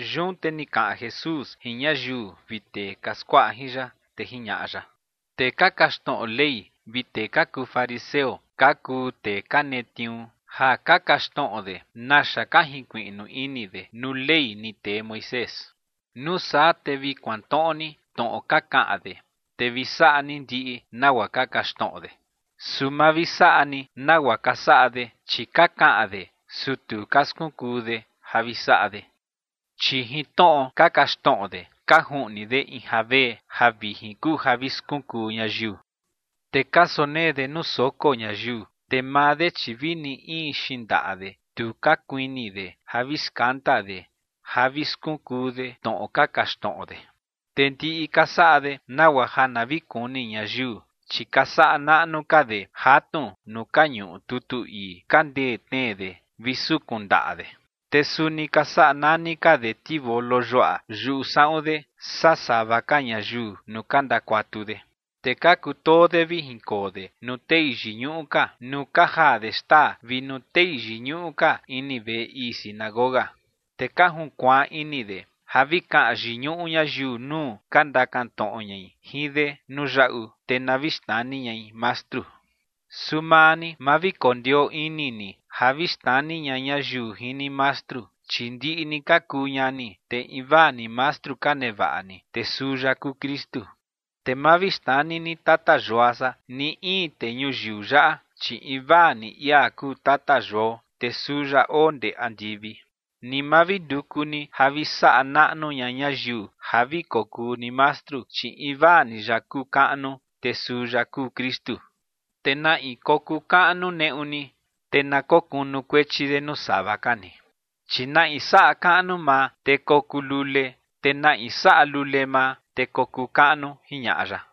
Yun te ni kaꞌan Jesús jin ñayiu vi tee ka skuaꞌa jin ya, te jiñaꞌa ya: ͏―͏Tee ka kaxtnoꞌo Ley vi tee ka kuu fariseo ka kuu tee ka netniuu ja ka kaxtnoꞌo de naxa ka jinkuiꞌnu ini de nuu Ley ni tee Moisés. Nuu saa te vi kuantnoꞌo ni tnoꞌo ka kaꞌan de, te vi saꞌa ni ndiꞌi nagua ka kaxtnoꞌo de. Su ma vi saꞌa ni nagua ka saꞌa de, chi ka kaꞌan de, su tu ka skunkuu de ja vi saꞌa de. Chi jin tnoꞌo ka kaxtnoꞌo de ka juꞌni de in javee, ja vijin kuu ja vi skunkuu ñayiu. Te ka sonee de nuu soko ñayiu, te maa de, chi vini in xindaꞌa de tu ka kuini de ja vi skanda de ja vi skunkuu de tnoꞌo ka kaxtnoꞌo de. Te ndiꞌi ka saꞌa de nagua ja na vi kuni ñayiu, chi ka saꞌa naꞌnu ka de jatnu nuu ka ñuꞌu tutu ii ka ndee tnee de vi sukun ndaꞌa de, te suni ka saꞌa nani ka de tivolo yuaꞌa yuꞌu saꞌun de saa sava ka ñayiu nuu ka ndakuatu de. Te ka kutoo de vi jinkoo de nuu tei yiñuꞌu ka nuu ka jaa de xtaa vi nuu tei yiñuꞌu ka ini veꞌe ii sinagoga. Te ka junkuaan ini de ja vi kaꞌan yiñuꞌu ñayiu nuu ka ndakan tnoꞌo ñai jin de nuu yaꞌu, te na vi xnani ñai mastru. ’Su maa ni, ma vi kondioo ini ni ja vi xnani ña ñayiu jin ni mastru, chi ndiꞌi ni ka kuu ñani, te invaa ni mastru ka nevaꞌa ni, te suu ya kuu Kristu. Te ma vi xnani ni “tata yua san” ni in tee ñuyiu yaꞌa, chi invaa ni ia kuu tata yuao, te suu ya oo ndee andivi. Ni ma vi nduku ni ja vi saꞌa naꞌnu ña ñayiu ja vi kokuu ni mastru, chi invaa ya kuu kaꞌnu, te suu ya kuu Kristu. Te na in kokuu kaꞌnu neꞌu ni, te na kokunukuechi de nuu sava ka ni. Chi na in saꞌa kaꞌnu maa, te kokuu lule. Te na in saꞌa lule maa, te kokuu kaꞌnu ͏―͏jiñaꞌa ya.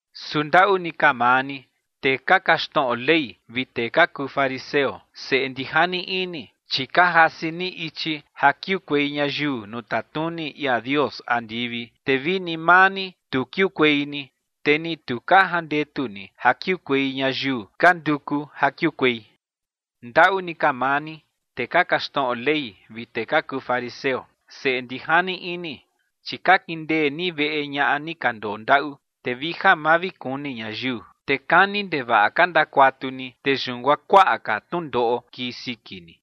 ’¡Su ndaꞌu ni ka maa ni, tee ka kaxtnoꞌo Ley vi tee ka kuu fariseo, seꞌe ndijani ini! Chi ka jasi ni ichi ja kiukuei ñayiu nuu tatnuni ia Dios andivi, te vini maa ni, tu kiukuei ni, te ni tu ka jandetu ni ja kiukuei ñayiu ka nduku ja kiukuei. ’¡Ndaꞌu ni ka maa ni, tee ka kaxtnoꞌo Ley vi tee ka kuu fariseo, seꞌe ndijani ini! Chi ka kindee ni veꞌe ñaꞌa ni ka ndondaꞌu, te vi ja ma vi kuni ñayiu, te kani ndevaꞌa ka ndakuatu ni. Te yun guaa kuaꞌa ka tnundoꞌo kii siki ni.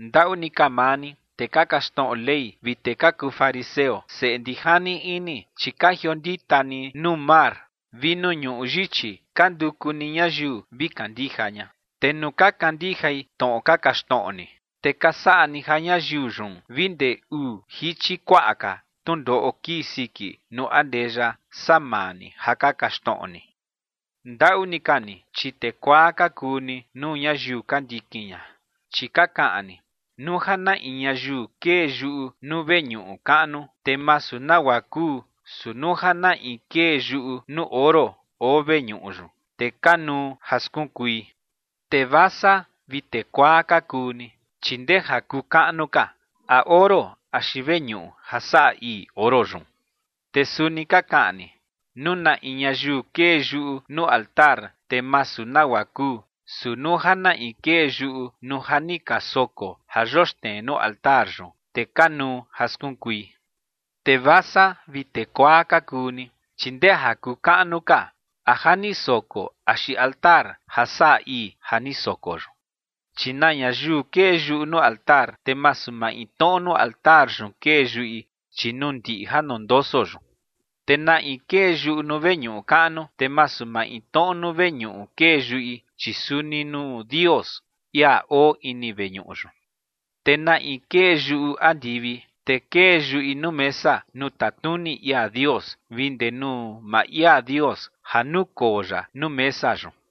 ’¡Ndaꞌu ni ka maa ni, tee ka kaxtnoꞌo Ley vi tee ka kuu fariseo, seꞌe ndijani ini! Chi ka jiondita ni nuu mar vi nuu ñuꞌu yichi, ka nduku ni ñayiu vi kandija ña. Te nuu ka kandijai tnoꞌo ka kaxtnoꞌo ni, te ka saꞌa ni ja ñayiu yun vi ndee uu jichi kuaꞌa ka tnundoꞌo kii siki nuu andeya, saa maa ni ja ka kaxtnoꞌo ni. ’¡Ndaꞌu ni ka ni, chi tee kuaa ka kuu ni nuu ñayiu ka ndikin ña! Chi ka kaꞌan ni: “Nuu ja na in ñayiu kee yuꞌu nuu veñuꞌu kaꞌnu, te masu nagua kuu, su nuu ja na in kee yuꞌu nuu oro oo veñuꞌu yun, te kanuu ja skunkui”. ¡Tee vasa vi tee kuaa ka kuu ni! Chi ¿ndee ja kuu kaꞌnu ka, a oro axi veñuꞌu ja saꞌa ii oro yun? Te suni ka kaꞌan ni: “Nuu na in ñayiu kee yuꞌu nuu altar, te masu nagua kuu, su nuu ja na in kee yuꞌu nuu ja ni ka soko ja yoxnee nuu altar yun, te kanuu ja skunkui”. ¡Tee vasa vi tee kuaa ka kuu ni! Chi ¿ndee ja kuu kaꞌnu ka, a ja ni soko axi altar ja saꞌa ii ja ni soko yun? Chi na ñayiu kee yuꞌu nuu altar, te masu maintnoꞌo nuu altar yun kee yuꞌi, chi nuu ndiꞌi ja ndondoso yun. Te na in kee yuꞌu nuu veñuꞌu kaꞌnu, te masu maintnoꞌo nuu veñuꞌu kee yuꞌi, chi suni nuu Dios, ia oo ini veñuꞌu yun. Te na in kee yuꞌu andivi, te kee yuꞌi nuu mesa nuu tatnuni ia Dios vi ndee nuu maa ia Dios ja nukoo ya nuu mesa yun.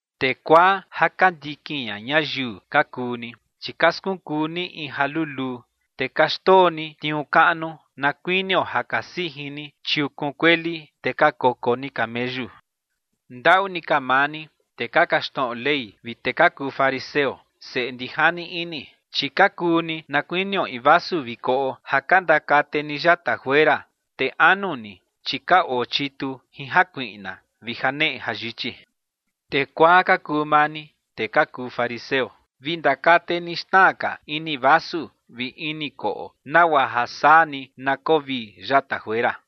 ¡Tee kuaa ja ka ndikin ña ñayiu ka kuu ni, chi ka skunkuu ni in ja luluu, te ka xndoo ni tniuu kaꞌnu, na kuinio ja ka sijin ni chiukun kueli, te ka koko ni cameyu! ’¡Ndaꞌu ni ka maa ni, tee ka kaxtnoꞌo Ley vi tee ka kuu fariseo, seꞌe ndijani ini! Chi ka kuu ni na kuinio in vasu vi koꞌo ja ka ndakate ni yata juera, te anu ni, chi ka oo chitu jin jakuiꞌna vi janeꞌe jayichi. ¡Tee kuaa ka kuu maa ni, tee ka kuu fariseo! Vi ndakate ni xna ka ini vasu vi ini koꞌo, nagua ja saa ni na koo vii yata juera.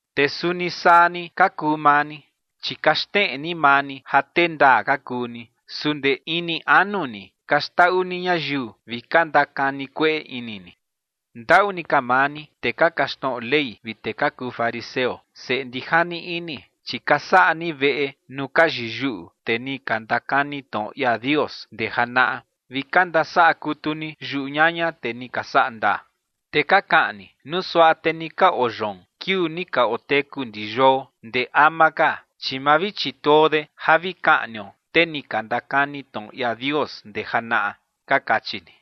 Te suni saa ni ka kuu maa ni, chi ka xneꞌe ni maa ni ja tee ndaa ka kuu ni, su ndee ini anu ni ka xndaꞌu ni ñayiu vi ka ndakani kueꞌe ini ni. ’¡Ndaꞌu ni ka maa ni, tee ka kaxtnoꞌo Ley vi tee ka kuu fariseo, seꞌe ndijani ini! Chi ka saꞌa ni veꞌe nuu ka yiyuꞌu tee ni ka ndakani tnoꞌo ia Dios ndee janaꞌa, vi ka ndasaꞌa kutu ni yuꞌu ñaña tee ni ka saꞌa ndaa. Te ka kaꞌan ni: “Nuu suaꞌa te ni ka oo yoon kiuu ni ka oteku ndi yuao ndee ama ka, chi ma vi chituo de ja vi kaꞌnio tee ni ka ndakani tnoꞌo ia Dios ndee janaꞌa”, ka kachi ni.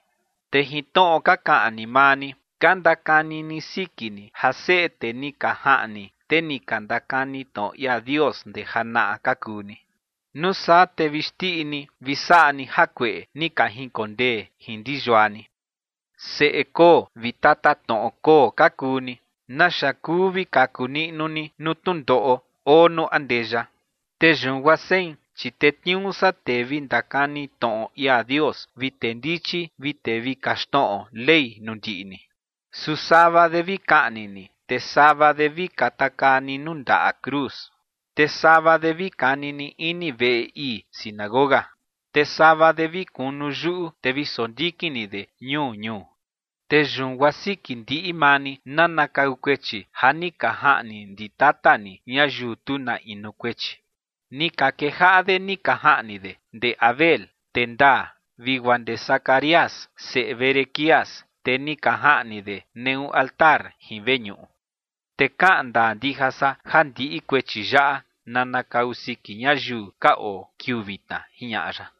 Te jin tnoꞌo ka kaꞌan ni maa ni, ka ndakani ni siki ni ja seꞌe tee ni ka jaꞌni tee ni ka ndakani tnoꞌo ia Dios ndee janaꞌa ka kuu ni. Nuu saa te vi xndiꞌi ni vi saꞌa ni jakueꞌe ni ka jinkondee jin ndi yua ni. ’¡Seꞌe koo vi tatatnoꞌo koo ka kuu ni! ¿Naxa kuu vi kaku niꞌnu ni nuu tnundoꞌo oo nuu andeya? Te yun guaa sein, chi tetniuu san tee vi ndakani tnoꞌo ia Dios vi tee ndichi vi tee vi kaxtnoꞌo Ley nuu ndiꞌi ni. Su sava de vi kaꞌni ni; te sava de, vi katakaa ni nuu ndaꞌa cruz; te sava de vi kani ni ini veꞌe ii sinagoga; te sava de vi kunu yuꞌu, te vi sondikin ni de ñuu ñuu. Te yun guaa siki ndiꞌi maa ni nanakau kuechi ja ni ka jaꞌni ndi tata ni ñayiu tu na inu kuechi. Ni ka kejaꞌa de ni ka jaꞌni de ndee Abel, tee ndaa, vi guaa ndee Zacarías, seꞌe Berequías, tee ni ka jaꞌni de neꞌu altar jin veñuꞌu. Te kaꞌan ndaa ndija san ja ndiꞌi kuechi yaꞌa nanakau siki ñayiu ka oo kiuu vitna ͏―͏jiñaꞌa ya.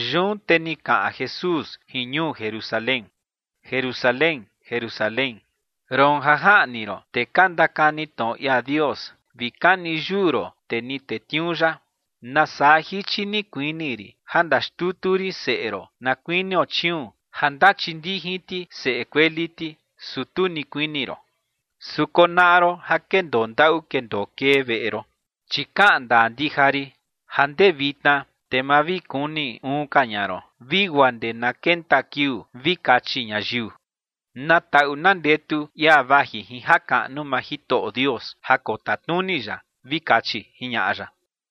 Yun te ni kaꞌan Jesús jin ñuu Jerusalén: ͏―͏Jerusalén, Jerusalén, roon ja jaꞌni ron tee ka ndakani tnoꞌo ia Dios vi kani yuu ron tee ni tetniuu ya, ¡nasaa jichi ni kuini rin ja ndaxtutu rin seꞌe ron na kuinio chiuun ja ndachindijin ti seꞌe kueli ti, su tu ni kuini ron! Su konaꞌa ron ja kendoo ndaꞌu kendoo kee veꞌe ron. Chi kaꞌan ndaa ndija rin ja ndee vitna, te ma vi kuni uun ka ña ron vi guaa ndee na kenta kiuu vi kachi ñayiu: “¡Na taꞌu na ndetu ia vaji jin jakaꞌnu maa Jitoꞌo Dios ja kotatnuni ya!”, vi kachi ͏―͏jiñaꞌa ya.